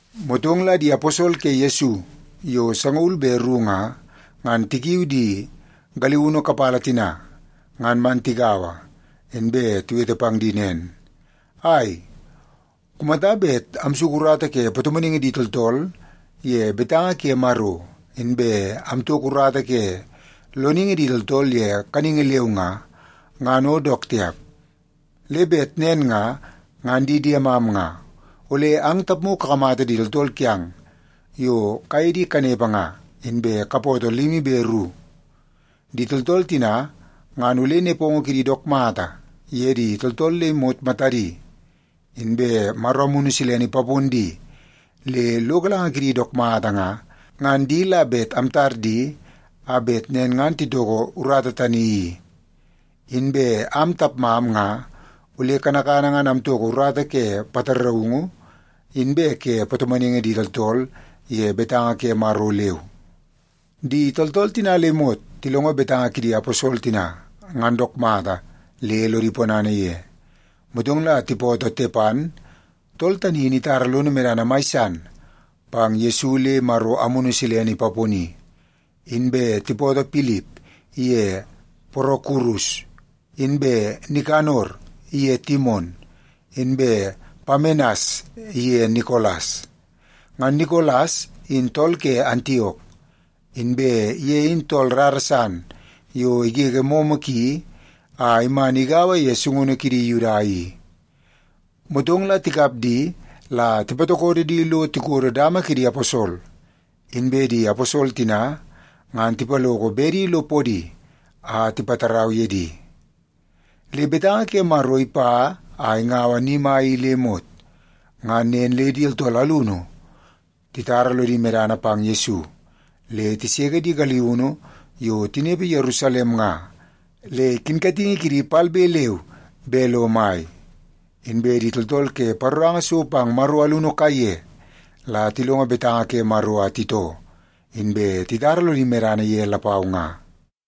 Motong la di aposol ke Yesu yo sangaul be ru nga, ngan tikiu di galiunu kapala tina ngan man tigaua, inbe tiwete pang di nen, “Ai, kumata bet amsuku urata ke patomonaingi di tooltool ye betanga ke Maro, inbe amtoko urata ke loningi di tooltool ye kaningi leu nga, ngan o dook tiap. Le bet nen nga, ngan di diemam nga, ole ang tapmu kakamata di tooltool kiang yo kaye di kanepe nga, inbe kapootoo limi be ru. Di tooltool tina ngan ole nepongo kidi dook mata ye di tooltool le imot matadi, inbe Maro Amunu Silene ipapon di le lo galanga kidi dook mata nga, ngan di la bet amtar di a bet nen ngan titoko urata tani i. Inbe am tapmam nga ole kanakana ngan amtoko urata ke pataraungu inbe ke patomonaingi di tooltool ye betanga ke Maro leu.” Di tooltool tina le imot tilongo betanga kidi aposol tina, ngan dook mata le lodi ponana ye. Motong la tipootoo Tepan, tool tani in itara lono medana mai san pang Yesu le Maro Amunu Silene ipaponi. Inbe tipootoo Pilip iye Porokurus, inbe Nikanor iye Timon, inbe Pamenas iye Nikolas. Ngan Nikolas in tool ke Antiok, inbe ye in tool rara san yo igege momo ki a iman igaua ye sungunu kidi Yuda i. Motong la tikap di la tipatokodo di lo tikodo dama kidi aposol, inbe di aposol tina ngan tipaloko bedi lo podi a tipatarau ye di. Le betanga ke Maro ipa a ingaua ni mai i le imot. Ngan nen le di tooltool alunu titara lodi medana pang Yesu, le tiseke di galiunu yo tinepe Yerusalem nga, le kinkatingi kidi palbe leu be lo mai. Inbe di tooltool ke paroranga so pang Maro alunu kaiye la tilongo betanga ke Maro a titoo, inbe titara lodi medana ye lapau nga.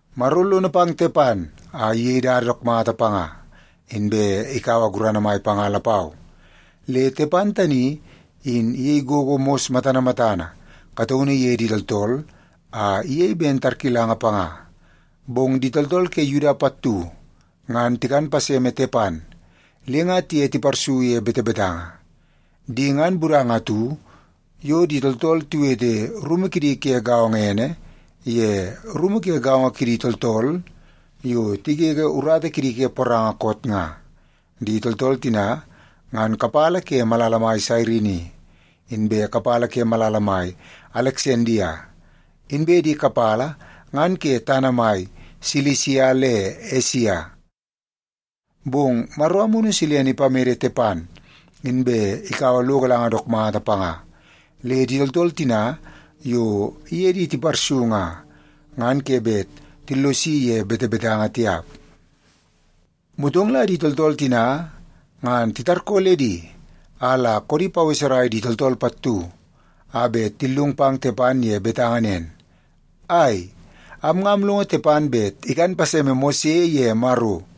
Maro lono pang Tepan a iyei dada dook mata panga, inbe ikaua gurana mai panga lapau. Le Tepan tani in iyei gogo mos matana matana kataunu ye di tooltool a iyei ben tarkilanga panga. Bong di tooltool ke Yuda pattu ngan tikan paseme Tepan le nga tiye tiparsu ye betebetanga. Di ngan budanga atu yo di tooltool tiwete rumu kidi ke gaongo ene ye Rumu Ke Gaongo Kidi Tooltool Yo Tigege Urata Kidi Ke Poranga Koot nga. Di tooltool tina ngan kapala ke malala mai Sairini, inbe kapala ke malala mai Aleksandia, inbe di kapala ngan ke tana mai Silisia le Esia. Bong Maro Amunu Silene ipamede Tepan, inbe ikaua lo galanga dook mata panga, le di tooltool tina yo iye di tiparsu nga, ngan ke bet tillosi ye betebetanga tiap. Motong la di tooltool tina ngan titarkooledi a la koodi paweserai di tooltool pattu a bet tillung pang Tepan ye betanga nen, “Ai, am nga amlongo Tepan bet ikan paseme Mose ye Maro.”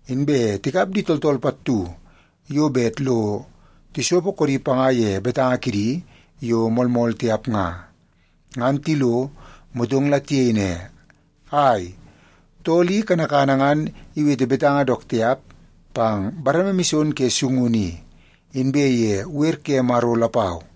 Inbe tikap di tooltool pattu yo bet lo tisopo koodi panga ye betanga kidi yo moolmool tiap nga. Ngan tilo, motong la tiyei ne, “Ai, tool i kanakana ngan iwete betanga dook tiap pang bareme mison ke sungunu i, inbe ye wer ke Maro lapau.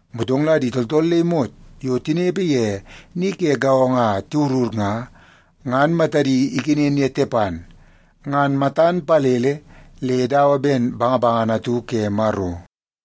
Motong la di tooltool le imot yo tinepe ye ni ke gaongo a tiwurur nga, ngan matadi ikenen ye Tepan, ngan matan palele le dawa ben bangabangana atu ke Maro.